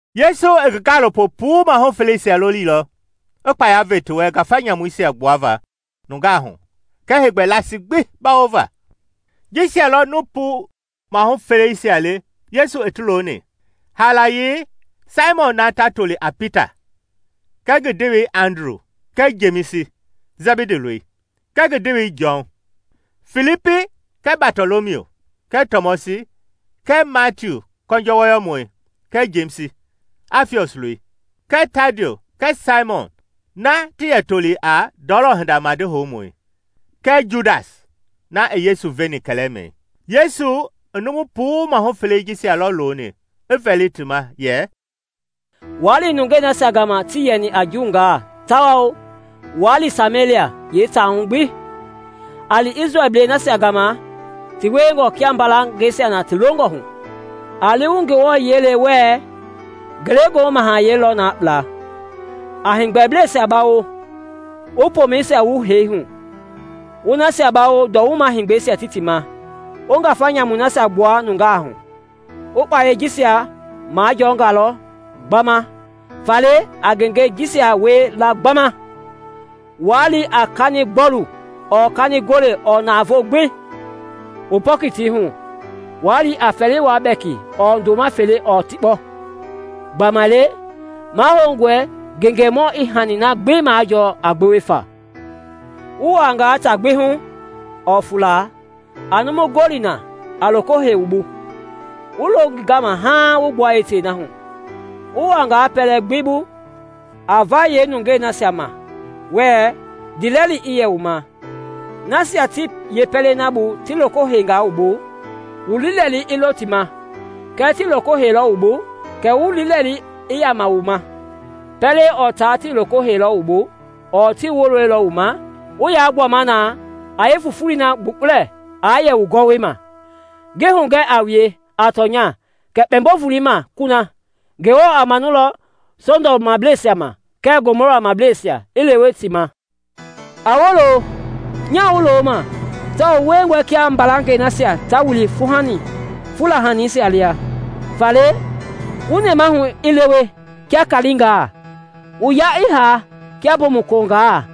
Yesu i ngi gaalopo puu maahu feleisia lolilɔ i kpaya ve ti wɛ ngafa nyamuisia gbuava nungaa hu kɛɛ heegbɛ laasi gbi bawova. Jisia lɔ nuu puu mahu feleisia le Yesu i ti looni: haalayei, Saimɔn na ta toli a Pita kɛɛ ngi ndewei Andru kɛɛ Jemisi, Sɛbidi loi, kɛɛ ngi ndewei Jɔn; Filipi kɛɛ Batɔlɔmiu kɛɛ Tɔmɔsi kɛɛ Matiu kɔnjɔ wɔyɔmɔi kɛɛ Jemisi, Afiɔs loi, kɛɛ Tadiu, kɛɛ Saimɔn na ti yɛ toli a ndɔlɔ hinda madi houmɔi, kɛɛ Judasi, na i Yesu veni kɛlɛmɛi. Yesu i numu puu maahu felei jisia lɔ loni, i vɛli ti ma yɛ, “Waa li nungei nasia gama tii yɛni a Juungaa tawao waa li Samelia yeetaa gbi hu. A li Isrɛlblei nasia gama ti wiengɔ kia mbalangɛi nasia ta lohu. A li wu Ngewɔ yiɛi le wɛɛ, ‘Ngelegoohu Mahayɛi lɔ na kpla.’ A heegbɛbleisia bawo, wu pomɛisia wu hee hu, wu nasia bawo nduwuma-heegbɛisia ti ti ma, wu ngafa nyamuisia gbua nungaa hu. Wu kpayei jisia majɔngalɔ gbama, faale a ngengei jisia wie la gbama. Waa li a kanigbɔlu ɔɔ kanigole ɔɔ navoo gbi; wu pɔkiti hu; waa li a fɛliwua bɛki ɔɔ ndoma fele ɔɔ tikpɔ. Gbamaile mahoungɔe ngengemɔi i hani na gbi majɔɔ a gbewe fa. “Wu wuaangaa taa gbi hu ɔɔ fuula, a numu gɔli na a loko hei wu bu, wu lo ngi gama haaŋ wu gbua yeetei na hu. Wu wuaangaa pɛlɛ gbi bu, a va yeenungaa ma wɛɛ, ‘Ndiilɛli i yɛ wu ma.’ Nasia ti yeepɛlei na bu ti loko heingaa wu bu, wu liilɛli i lo ti ma; kɛɛ tii loko heilɔ wu bu, kɛ wu liilɛlii i yaama wu ma. Pɛlɛ ɔɔ taa tii loko heilɔ wu bu ɔɔ tii woloilɔ wu ma, wu yaa gbuama na a fufulei na gbukpulɛ a yɛ wu gɔwɔma. “Ngi hugɛ a wue a tɔnya kɛ kpɛmbo-volei ma kuna, Ngewɔ a manulɔ Sɔdɔmblɛisia ma kɛɛ Gomɔrablɛisia i lewe tɛɛ na ma. “A wolo! Nyaa wu loma tawao wu wiengɔe kia mbalangɛi nasia ta wili fula haningaa lia. Faale wu nɛmahu i lewe kia kaalingaa, wu yaa i haa kia mbomu kulongaa.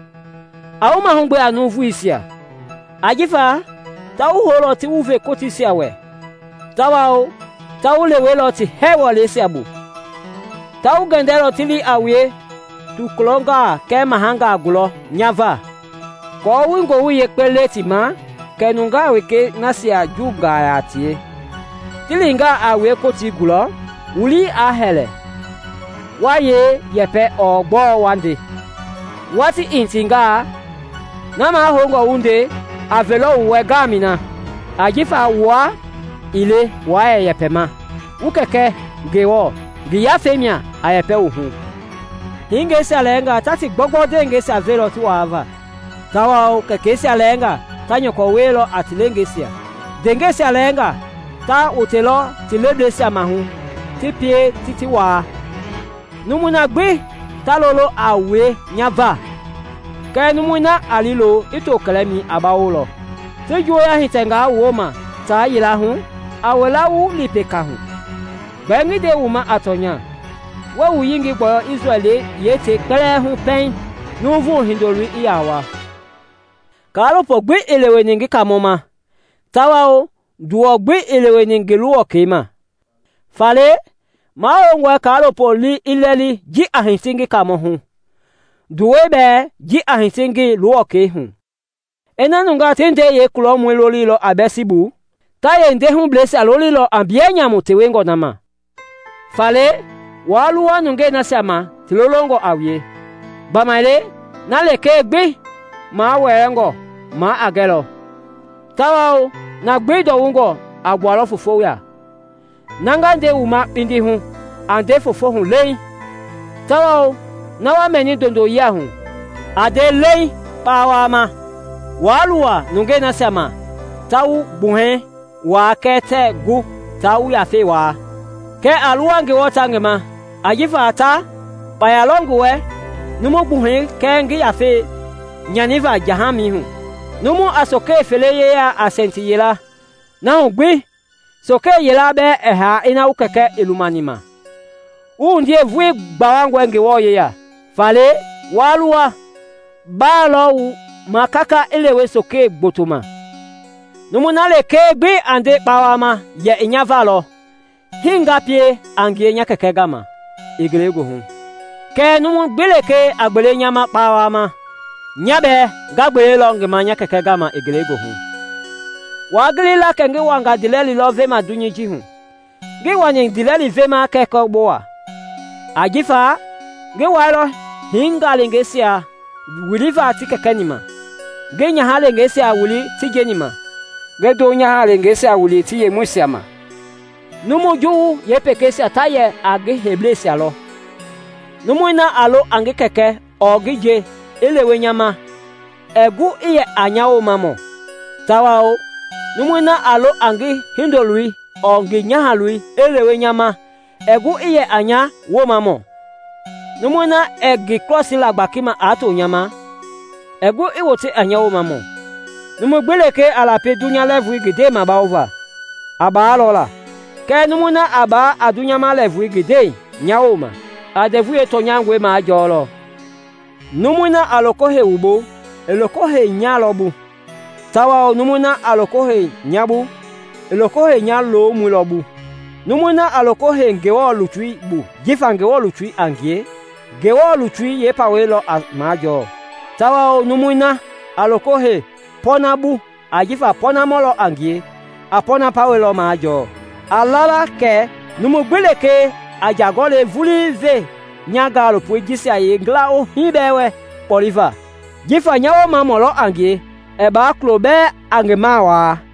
A wu mahugbe a nuuvuisia; ajifa ta wu houlɔ ti wu ve kootiisia wɛ, tawao ta wu lewelɔ ti hɛɛ wɛleisia bu. Ta wu gɛndɛlɔ ti li a wue tokulɔngaa kɛɛ mahangaa gulɔ nya va, aako wu Ngowili Yekpei le ti ma kɛɛ nungaa wekei nasia Juungaa yaa a tie. Ti lingaa a wue Kotii gulɔ, wu lii aa hɛlɛ waa yee yɛpɛ ɔɔ gbɔɔ wa nde; watii i hitingaa, na mahoungɔ wu nde a velɔ wu wɛ ngaamɛi na; ajifa wua ii le waa yɛ yɛpɛma, wu Kɛkɛ Ngewɔ ngi Yafei mia a yɛpɛ wu hu. “Hingeisia lɛɛnga ta ti gbɔugbɔu ndewehingeisia velɔ ti waava, tawao kɛkɛisia lɛɛngaa ta nyɔkɔ wielɔ a ti leengeisia; ndeengɛisia lɛɛngaa ta wotelɔ ti lebleisia maahu ti pie ti ti waa. Numui gbi ta lololɔ a wue nya va. Kɛɛ numui na a liilo i to kɛlɛmɛi a bawolɔ. Ti juuya hitɛngaa wu woma taa yila hu, a wila wu li peka hu. Gbɛɛ ngi nde wu ma a tɔnya, wɛɛ wu yengei gbɔyɔ Isrɛl yeetei kpɛlɛɛ hu pɛiŋ Nuuvu Hindoloi i ya wa. “Kaalopo gbi ii leweni ngi Kaamɔ ma, tawao nduwɔ gbi ii leweni ngi luwɔkɛi ma. Faale mahoungɔ kaalopoi lii i lɛli ji a hiti ngi Kaamɔ hu, nduwɛi bɛɛ ji a hiti ngi luwɔkɛi hu. Ina nungaa ti ndei yeekulɔmɔi lolinga a Biɛlsibu, ta yeendei hubleisia lolilɔ a mbiyɛ nyamungaa tewengɔ na ma. “Faale waa luwa nungei nasia ma ti lolongɔ a wue; gbamaile na lekee gbi mawɛɛngɔ maa a gɛlɔ, tawao na gbi ndɔwungɔ a gbualɔ foofo ya. Na nga nde wu ma kpindi hu, a nde foofo hu leeŋ, tawao na wa mɛni ndondoyia hu, a nde leeŋ kpawama. Waa luwa nungei nasia ma ta wu gbuhɛi waa kɛɛ tɛɛ gu taa wu yafei waa; kɛ a luwa Ngewɔ ta ngi ma ajifa ta lɔ kpaya i ngi wɛ numu gbuhɛi kɛɛ ngi yafei nyanivaa jahamɛi hu. Numu a sokele fele yeyalɔ a sɛnti yila, na hu gbi sokele yila bɛɛ ɛɛ haa ina wu Kɛkɛ ii lumani ma. Wu wundie vulii gbawangɔe Ngewɔ yeya. Faale waa luwa; baa lɔ wu ma kaka i lewe sokele gboto ma. “Numui na lekee gbi a nde kpawama yɛ i nya va lɔ, hii nga pie a ngie nya Kɛkɛ na gama i ngelegoohu. Kɛɛ numu gbi lekee a gbele nya ma kpawama, nya bɛɛ nga gbelelɔ ngi ma nya Kɛkɛ na gama i ngelegoohu. “Waa gili la kɛ ngi wanga ndiilɛli lɔ veva dunyei ji hu; ngii wani ndiilɛli veva kɛ kɔbowa. Ajifa, ngi waalɔ hingaleengeisia wilivaa ti kɛkɛ-ni ma, ngi nyaha-lengeisia wili ti njeni ma, ngi ndo-nyahangeisia wili ti yemɔisia ma; numu juwu yeekpekpeisia ta yɛ a ngi heiblɛisia lɔ. “Numui na a lo a ngi kɛkɛ ɔɔ ngi nje i lewe nya ma ɛɛ gu i yɛ a nya woomamɔ; tawao numui na a lo a ngi hindoloi ɔɔ ngi nyahaloi i lewe nya ma ɛɛ gu i yɛ a nya Woomamɔ. Numui na ɛɛ ngi krɔsii la gbakima aa to nya wooma ɛɛ gu i yɛ a nya Woomamɔ. Numu gbi lekee a lapi dunya lɛɛvui ngi ndɛi mabawova, a baalɔ la, kɛɛ numui na a baa a dunyama lɛɛvui ngi ndɛi nya wooma, a ndɛvui yeetɔnyangɔi majɔlɔ. “Numui na a loko hei wu bu, i loko heini nya lɔ bu; tawao numui na a loko hei nya bu, i loko heini nya loomɔi lɔ bu. Numui na a loko hei Ngewɔ lutui bu jifa Ngewɔ lutui a ngie, a Ngewɔ lutui yeepawei lɔ majɔɔ, tawao numui na a loko hei pɔɔnamɔ bu ajifa pɔɔnamɔ a ngie, a pɔɔnamɔ pawa lɔ majɔɔ. A la la kɛ numu gbi lekee a nja gɔlɛi vulii ve nya gaalopoi jisia yeekulohii bɛɛ wɛ kpɔleva jifa nya woomamɔ a ngie, ɛɛ baa kulo bɛɛ a ngi mawaa.”